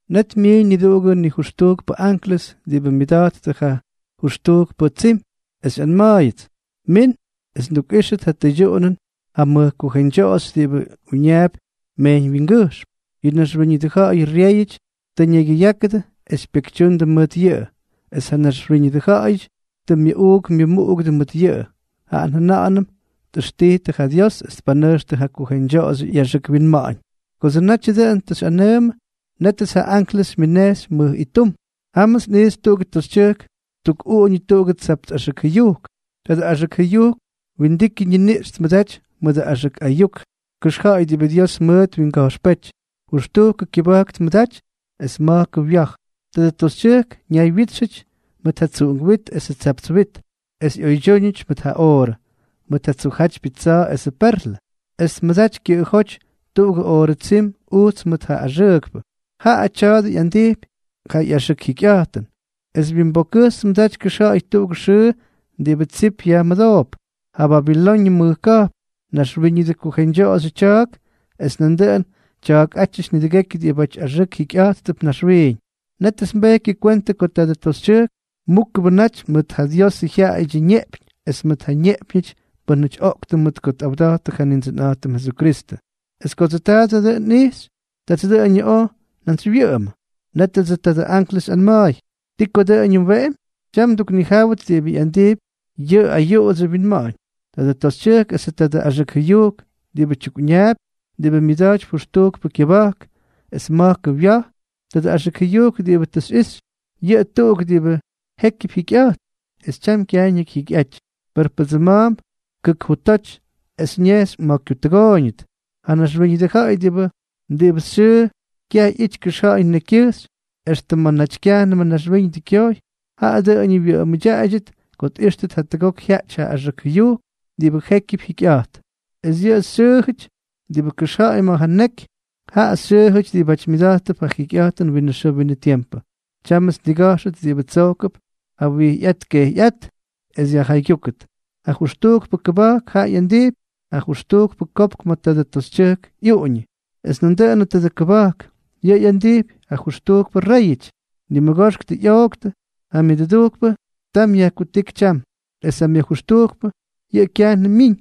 Net myiiñ niduꞌugʉ nijʉxtujkpʉ anklʉs diꞌibʉ myʉda̱jttʉ ja jʉxtujkpʉ tsim, es xyꞌanma̱a̱yʉts: —Min es ndukꞌíxʉt ja tyʉydyuꞌunʉn ja mʉj kujeñdyoꞌoxy diꞌibʉ uñaapy mejyñwyingʉjxm. Yʉ naxwíñʉdʉ ja̱ꞌa̱yʉ ryéyʉty tʉ ñaygyʉyákʉdʉ es pyekytyundʉ mʉt yʉꞌʉ, es ja naxwíñʉdʉ ja̱ꞌa̱yʉty tʉ myuꞌuuk myʉmuꞌugʉdʉ mʉt yʉꞌʉ, jaꞌa njʉna̱ꞌa̱nʉm tꞌʉxtijtʉ ja Dios es tpanʉjxtʉ ja kujeñdyoꞌoxyʉ ꞌyaxʉk winma̱ꞌa̱ñ. Kodsʉ natyʉ dʉꞌʉn tʉ xyꞌawanʉ, nétʉts ja anklʉs xymyʉnejxy mʉj ittum. Jámʉts nꞌijxy tuꞌugʉ toxytyʉjk ttukꞌuꞌuñʉ tuꞌugʉ tsapts axʉk jʉyujk. Tadʉ axʉk jʉyujk windikyʉ ñiniꞌx tmʉdaty mʉdʉ axʉk ayuk kʉxja̱ꞌa̱y diꞌibʉ Dios mʉʉt twinga̱jxpéty. Jʉxtujkʉ kyʉba̱jk tmʉdaty es ma̱jkʉ wya̱j. Tadʉ toxytyʉjk ñaywyítxʉty mʉt ja tsuꞌunk wit esʉ tsapts wit, es ꞌyoydyúñʉty mʉt ja oorʉ, mʉt ja tsujjátypyʉ tsa̱a̱ esʉ perlʉ. Es tmʉdaty kyʉꞌʉjóty tuꞌugʉ oorʉ tsim ujts mʉt ja axʉʉkpʉ. Jaꞌa tya̱a̱dʉ ꞌyandijpy ja ꞌyaxʉk jikyꞌa̱jtʉn. Es wyimbokkʉjxy tmʉdaty kʉxja̱ꞌa̱y tuꞌugʉ xʉʉ diꞌibʉ tsip yajmʉdoop: “Ja Babiloñʉ mʉj ka̱jpn, naxwíñʉdʉ kujeñdyoꞌoxyʉdyʉ tya̱a̱k es nandʉꞌʉn tya̱a̱kꞌátyʉty nidʉgekyʉ diꞌibáty axʉʉk jikyꞌa̱jttʉp naxwiiñ.” Nétʉts nbejkyʉ kwentʉ ko tadʉ toxytyʉjk múkʉbʉ naty mʉt ja Diosʉ jyaꞌayʉdyʉ ñeꞌpyñ es mʉt ja ñeꞌpyñʉty pʉ́nʉty oꞌktʉ mʉt ko tꞌawda̱jttʉ ja Nindsʉnꞌa̱jtʉm Jesukristʉ. Es kodsʉ taadʉ dʉꞌʉn nꞌijxy, tats dʉꞌʉñʉ oj njantsywyʉꞌʉmʉ. Nétʉdsʉ tadʉ anklʉs xyꞌanma̱a̱y: —¿Ti ko dʉꞌʉñʉ mweꞌemy? Tyam nduknijáwʉt diꞌibʉ ꞌyandijpy yʉ ayuꞌudsyʉ winma̱ꞌa̱ñ: tadʉ toxytyʉjk esʉ tadʉ axʉk jʉyujk diꞌibʉ tyukꞌuñaapy, diꞌibʉ myʉda̱jtypy jʉxtujkʉ kyʉba̱jk es ma̱jkʉ wya̱j. Tadʉ axʉk jʉyujk diꞌibʉ tʉ xyꞌixy, yʉꞌʉ tuꞌuk diꞌibʉ jékyʉp jikyꞌa̱jt, es tyam kyaj ñakyjyaaꞌáty, per pʉdsʉma̱a̱mp kʉk jutoty, es ñejxy ma̱ kyutʉgooyñʉt. ’Ja naxwíñʉdʉ ja̱ꞌa̱y diꞌibʉ xyʉʉ kyaꞌity kʉxja̱ꞌa̱y nekykyʉjxy extʉ ma̱ naty kyajnʉmʉ naxwíñʉdʉ kyoj, jaꞌa dʉꞌʉñʉ wyʉꞌʉmʉdyaꞌaydyʉt ko tꞌíxtʉt jatʉgok jyaꞌty ja axʉk jʉyujk diꞌibʉ jékyʉp jikyꞌa̱jt. Es yʉ xyʉʉjʉty diꞌibʉ kʉxja̱ꞌa̱y ma̱ ja neky, jaꞌa xyʉʉjʉty diꞌibáty myʉda̱jttʉp ja jikyꞌa̱jtʉn winʉ xʉʉ winʉ tiempʉ. ’Tyámʉts nniga̱jxʉt diꞌibʉ tsojkʉp ja wijyꞌát kejyꞌát es yajjaygyúkʉt. Ja jʉxtujkpʉ kʉba̱jk jaꞌa ꞌyandijpy ja jʉxtujkpʉ kopk ma̱ tadʉ toxytyʉjk ꞌyuꞌuñʉ. Es nandʉꞌʉnʉ tadʉ kʉba̱jk, yʉꞌʉ ꞌyandijpy ja jʉxtujkpʉ réyʉty. Nimʉgoxk tʉ ꞌyooktʉ, ja myʉdʉdujkpʉ tam yajkutíky tyam, es ja myʉjʉxtujkpʉ, yʉꞌʉ kyajnʉm myiñ.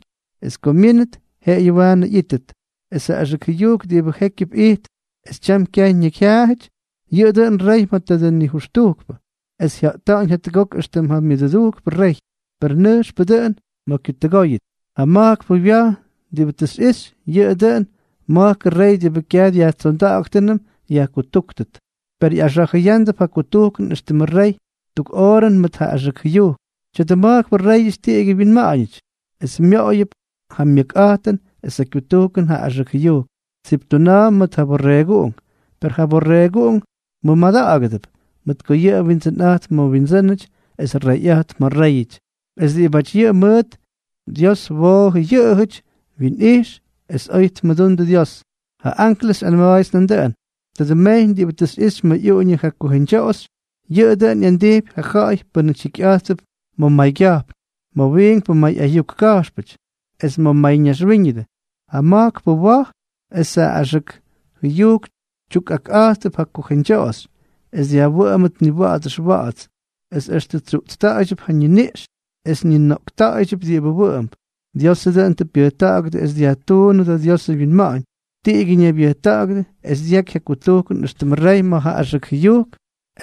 Es ko myínʉt, jeꞌeyʉ waanʉ ꞌyítʉt. Es ja axʉk jʉyujk diꞌibʉ jékyʉp ijt es tyam kyaj ñakyjyaaty, yʉꞌʉ dʉꞌʉn rey ma̱ tadʉ nijʉxtujkpʉ, es jya̱ꞌta̱ꞌa̱ñ jatʉgok éxtʉm ja myʉduktujkpʉ rey, per nʉjxpʉ dʉꞌʉn ma̱ kyutʉgooyñʉt. ’Ja ma̱jkpʉ wya̱j diꞌibʉ tʉ xyꞌixy, yʉꞌʉ dʉꞌʉn ma̱jkʉ rey diꞌibʉ kyaj dyajtsonda̱ꞌa̱ktʉnʉm yajkutúktʉt. Per ꞌyaxa̱jʉyándʉp ja kutujkʉn éxtʉmʉ rey tuk oorʉn mʉt ja axʉk jʉyujk. Tya̱dʉ ma̱jkpʉ réyʉty tiꞌigyʉ wyinma̱ꞌa̱ñʉty, es myoꞌoyʉp ja myʉkꞌa̱jtʉn es ja kyutujkʉn ja axʉk jʉyujk. Tsiptuna̱a̱mp mʉt ja Borreeguꞌunk. Per ja Borreeguꞌunk mʉmada̱ꞌa̱gʉdʉp, mʉt ko yʉꞌʉ Windsʉnꞌa̱jtp ma̱ windsʉ́nʉty es Reyꞌa̱jtp ma̱ réyʉty. Es diꞌibáty yʉꞌʉ mʉʉt, Dios woojʉ yʉꞌʉjʉty, wyinꞌix, es oy tmʉdundʉ Dios. Ja anklʉs xyꞌanma̱a̱yʉts nandʉꞌʉn: —Tadʉ mejyñ diꞌibʉ tʉ xyꞌixy ma̱ ꞌyuꞌuñʉ ja kujeñdyoꞌoxy, yʉꞌʉ dʉꞌʉn ꞌyandijpy ja ja̱ꞌa̱y pʉ́nʉty jikyꞌa̱jttʉp ma̱ maygya̱jpn, ma̱ wiinkpʉ may ayuk ka̱jxpʉty, es ma̱ mayñaxwíñʉdʉ. Ja ma̱jkpʉ wa̱j es ja axʉk jʉyujk tyukꞌakꞌátʉp ja kujeñdyoꞌoxy, es dyajwʉꞌʉmʉt niwa̱ꞌa̱ts ʉxwa̱ꞌa̱ts. Es extʉ tsyuꞌtsta̱ꞌa̱ydyʉp ja ñiniꞌx, es ñinoꞌkta̱ꞌa̱ydyʉp diꞌibʉ wʉꞌʉmp. Diosʉ dʉꞌʉn tʉ pyʉjta̱ꞌa̱gʉdʉ es dyajtuunʉdʉ Diosʉ wyinma̱ꞌa̱ñ, tiꞌigyʉ ñaybyʉjta̱ꞌa̱gʉdʉ es dyaky ja kutujkʉn éxtʉmʉ rey ma̱ ja axʉk jʉyujk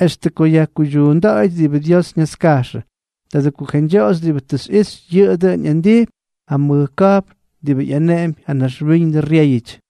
extʉ ko yajkuydyuunda̱ꞌa̱yʉt diꞌibʉ Dios ñaska̱jxʉ. Tadʉ kujeñdyoꞌoxy diꞌibʉ tʉ xyꞌixy, yʉꞌʉ dʉꞌʉn ꞌyandijpy ja mʉj ka̱jpn diꞌibʉ ꞌyaneꞌempy ja naxwíñʉdʉ ryéyʉty.